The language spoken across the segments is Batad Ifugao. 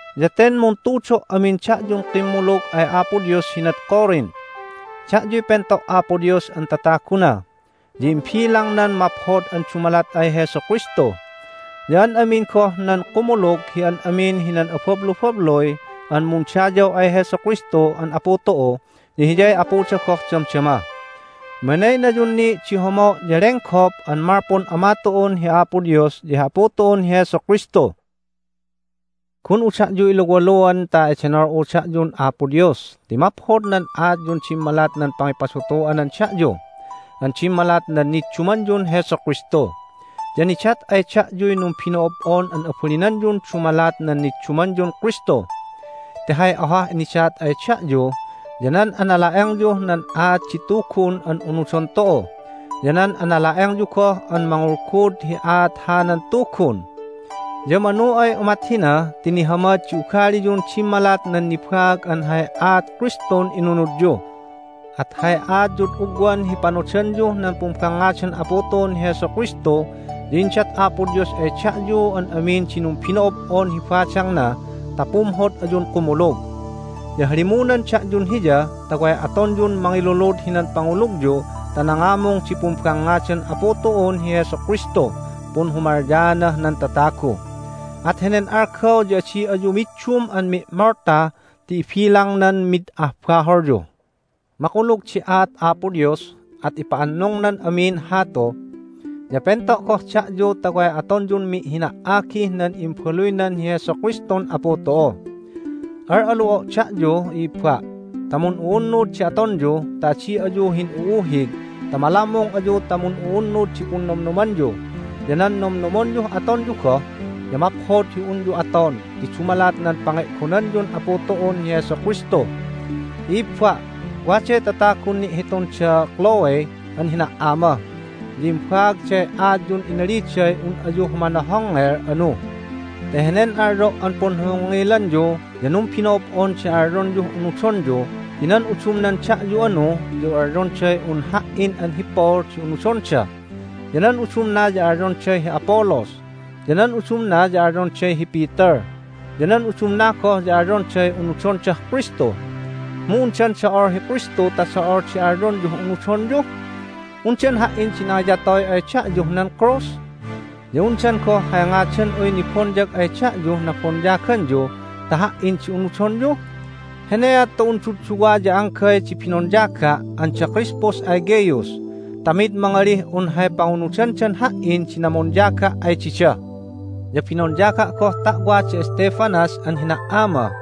Ya ten muntudo' amin da'yun kimmulug ay Apo Dios hinad Corinth. Da'yuy pento' Apo Dios an tataguna, ya imbilangnan maphod an dumalat ay Jesu Kristu, ya an amin goh nan kumulug hi an amin hinan abablubabluy an mundayaw ay Jesu Kristu an Apu tu'u ya Hiyay Apuda goh damdama. Minaynayun ni' di homo' ya lenggop an malpun Ama tu'un hi Apo Dios ya hi Apu tu'un hi Jesu Kristu. Gun'u da'yu iluwaluan ta edenol'u da'yun Apo Dios ti maphod nan aatyun dimmalat nan pangipadutu'anan da'yu an dimmalat nan niddumanyun Jesu Kristu. Ya nidat ay da'yuy numbino'ob'on an abalinanyun dumalat nan niddumanyun Kristu. Ti hay ohah nidat ay da'yu ya nan anala'engyuh nan aat di Tugun an unudon tu'u, ya nan anala'engyu goh an mangulgud hi aat hanan Tugun. Ya manu ay umat hina ti nihamad di ugaliyun dimmalat nan nibaag an hay aat Kristun inunudyu. At hay aatyud ugwan hi panodanyuh nan pumbangngadan Apu tu'un hi Jesu Kristu ya indat Apo Dios ay da'yu an amin di numbino'ob'on hi badangna ta pumhod ayun kumulug. Ya halimunan da'yun Hiya ta way atonyun mangilulud hinan pangulugyu ta nangamung di pumbangngadan Apu tu'un hi Jesu Kristuh punhumalyaanah nan tatagu. At henen algaw ya adi ayu middum an mi'molta ti ibilangnan mid ah baholyu. Makulug di aat Apo Dios, at ipa'annungnan amin hatu. Ya pento' goh da'yu ta way atonyun mi'hina"agih nan Imbaluynan hi Jesu Kristun Apu tu'u. Al'alu'o' da'yu, i'ibba', ta mun'u'unnud di atonyu ta adi ayu hin'u'uhig ta malammung ayu ta mun'u'unnud di punnomnomanyu ya nan nomnomonyuh atonyu goh. Ya maphod hi unyu aton ti dumalat nan pange'gonanyun Apu tu'un hi Jesu Kristu. I'ibba', waday tatagun ni'hitun da Chloe an hina"ama, ya imbaagday aatyun inaliday un ayu humanohongngel anu. Ti henen alyo' an punhohongngelanyu ya numbino'ob'on di alyonyuh unudonyu ti nan udumnan da'yu anu ya alyonday un ha"in an hi Paul di unudonda. Ya nan udumna ya alyonday hi Apollos, ya nan udumna ya alyonday hi Peter, ya nan udumna goh ya alyonday unudondah Kristu. Mu undan do'ol hi Kristu ta do'ol di alyonyuh unudonyu? Undan ha"in di nangiyatoy ay da'yuh nan krus? Ya undan goh hay ngadan'uy nibonyag ay da'yuh nabonyaganyu ta ha"in di unudonyu? Heneat ta un dudduwa ya anggay di binonyaga' an da Crispus ay Gaius ta mid mangalih un hay pangunudandan ha"in di namonyaga' ay dida! (Ya binonyaga' goh ta'wa da Stephanas an hina"ama,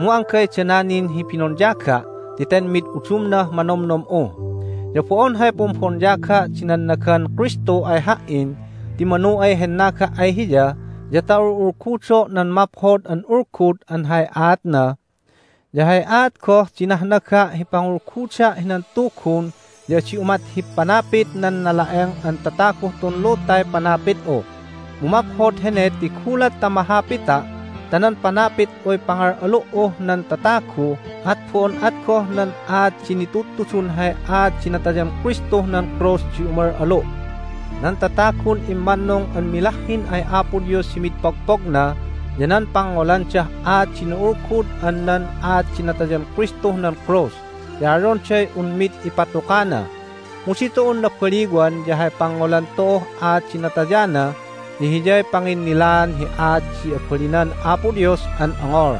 mu anggay dana nin hi binonyaga' ti ten mid udumnah manomnom'u.) Ya bo'on hay pumbonyaga' di nannagan Kristu ay ha"in, ti manu ay hennaga' ay Hiya ya ta ul'ulgudo' nan Maphod an Ulgud an hay aatna. Ya hay aat goh di nahnaga' hi pangulguda' hinan Tugun ya adi umat hi panapit nan nala'eng an tataguh tun lutay panapit'u, mu maphod hene ti gulat ta mahapita' ta nan panapit'uy pangal'alu"uh nan tatagu at bo'on at goh nan aat di nitudtudun hay aat di natayan Kristuh nan krus di umal'alu'. Nan tatagun immannung an milahhin ay Apo Dios hi mid pogpogna ya nan pangngolandah aat di na'ulgud an nan aat di natayan Kristuh nan krus ti alyonday un mid ipatukana. Mu ditu'un nabaliwan ya hay pangngolan tu'uh aat di natayana ya hiyay panginnilaan hi aat di abalinan Apo Dios an ongol.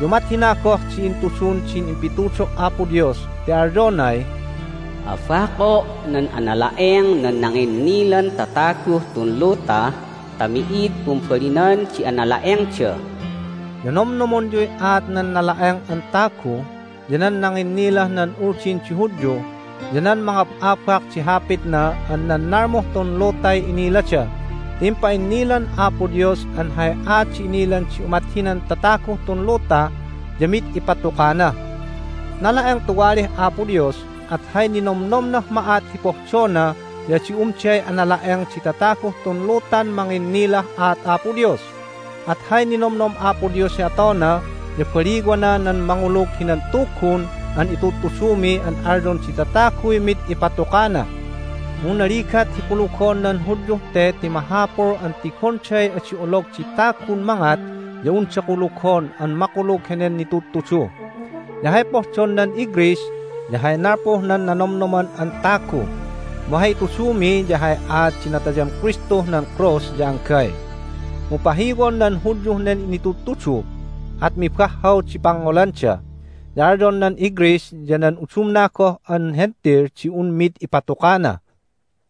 Ya umat hina goh di intudun din impitudo' Apo Dios, ti alyonay, "Abako' nan anala'eng nan nanginnilan tataguh tun luta ta mi'id pumbalinan di anala'engda." Ya nomnomonyuy aat nan nala'eng an tagu, ya nan nanginnilah nan Uldin di Hudyu, ya nan mangab'abak di hapitna an nan nalmuh tun lutay inilada, ti impa'innilan Apo Dios an hay aat di inilan di umat hinan tataguh tun luta ya mid ipatukana! Nala'eng tuwalih Apo Dios, at hay ninomnomnah ma'at hi pohdona ya adi umday anala'eng di tataguh tun lutan manginnilah aat Apo Dios. At hay ninomnom Apo Dios hi atona ya baliwana nan mangulug hinan Tugun an itudtudumi an alyon di tataguy mid ipatukana. Mu naligat hi kulugon nan Hudyuh te ti mahapul an tigonday adi olog di tagun mangat ya unda kulugon an makulug henen nitudtudu. Ya hay pohdon nan iGreece ya hay nalpuh nan nanomnoman an tagu. Mu hay itudumi ya hay aat di natayan Kristuh nan krus ya anggay. Mu pahiwon nan Hudyuh nen nitudtudu, at mibahhaw di pangngolanda, ya alyon nan iGreece ya nan udumna goh an Hentil di un mid ipatukana.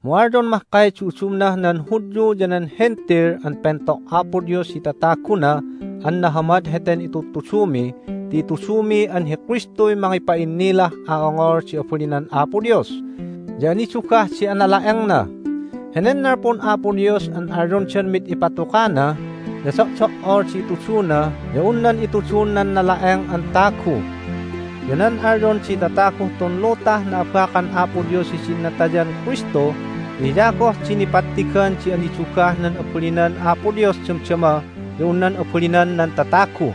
Mu alyon mahkay di udumnah nan Hudyu ya nan Hentil an pento' Apo Dios hi tataguna an nahamad heten itudtudumi ti itudumi an hi Kristuy mangipa'innilah a'ongol di abalinan Apo Dios, ya anidugah di anala'engna. Henen nalpun Apo Dios an alyondan mid ipatukana ya do'do"ol di ituduna ya un nan itudun nan nala'eng an tagu. Ya nan alyon di tataguh tun lutah na'abakan Apo Dios hidin natayan Kristu ya hiya goh di nipattigan di anidugah nan abalinan Apo Dios damdama ya un nan abalinan nan tatagu.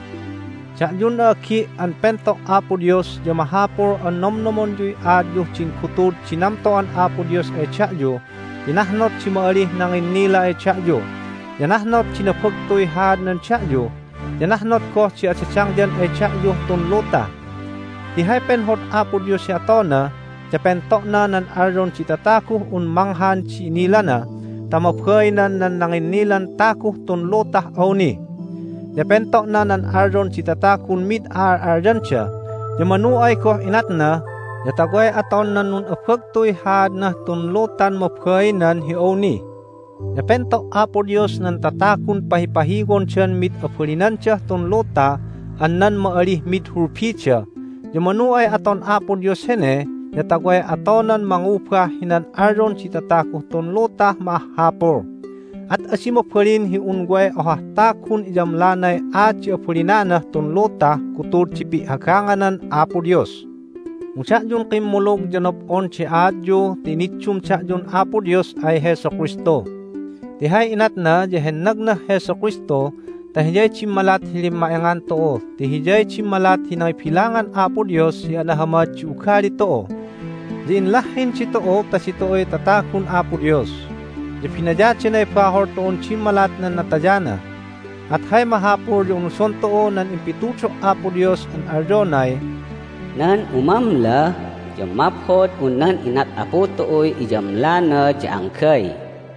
Da'yun a'agi' an pento' Apo Dios ya mahapul an nomnomonyuy aatyuh din gutud di namto'an Apo Dios ay da'yu ti nahnot di ma'alih nanginnila ay da'yu, ya nahnot di nabagtuy haadnan da'yu, ya nahnot goh di adadangyan ay da'yuh tun luta. Ti hay penhod Apo Dios hi atona ya pento'na nan alyon di tataguh un manghan di inilana ta mabainan nan nanginnilan taguh tun lutah awni. Ya pento'na nan alyon di tatagun mid a'al'alyanda, ya manu ay goh inatna ya ta way aton nan nun'abagtuy haadnah tun lutan mabainan hi awni. Ya pento' Apo Dios nan tatagun pahipahiwondan mid abalinandah tun luta an nan ma'alih mid hulbida, ya manu ay aton Apo Dios hene ya ta way atonan mangubah hinan alyon di tataguh tun lutah ma'ahhapul. At adi mabalin hi un way ohah tagun iyamlanay aat di abalinanah tun lutah gutud di pi'hagganganan Apo Dios. Mu da'yun kimmulug ya nob'on di aatyu ti iniddum da'yun Apo Dios ay Jesu Kristu. Ti hay inatna ya hennagnah Jesu Kristu ta Hiyay dimmalat hi limma'engan tu'u ti Hiyay dimmalat hi nangibilangan Apo Dios hi anahamad di ugali tu'u. Ya inlahhin ditu'u ta ditu'uy tatagun Apo Dios, ya binayadanay bahol tu'un dimmalat nan natayana. At hay mahapul ya unudon tu'u nan impitudo' Apo Dios an alyonay, "Nan umamla ya maphod un nan inat Apu tu'uy iyamlana ya anggay."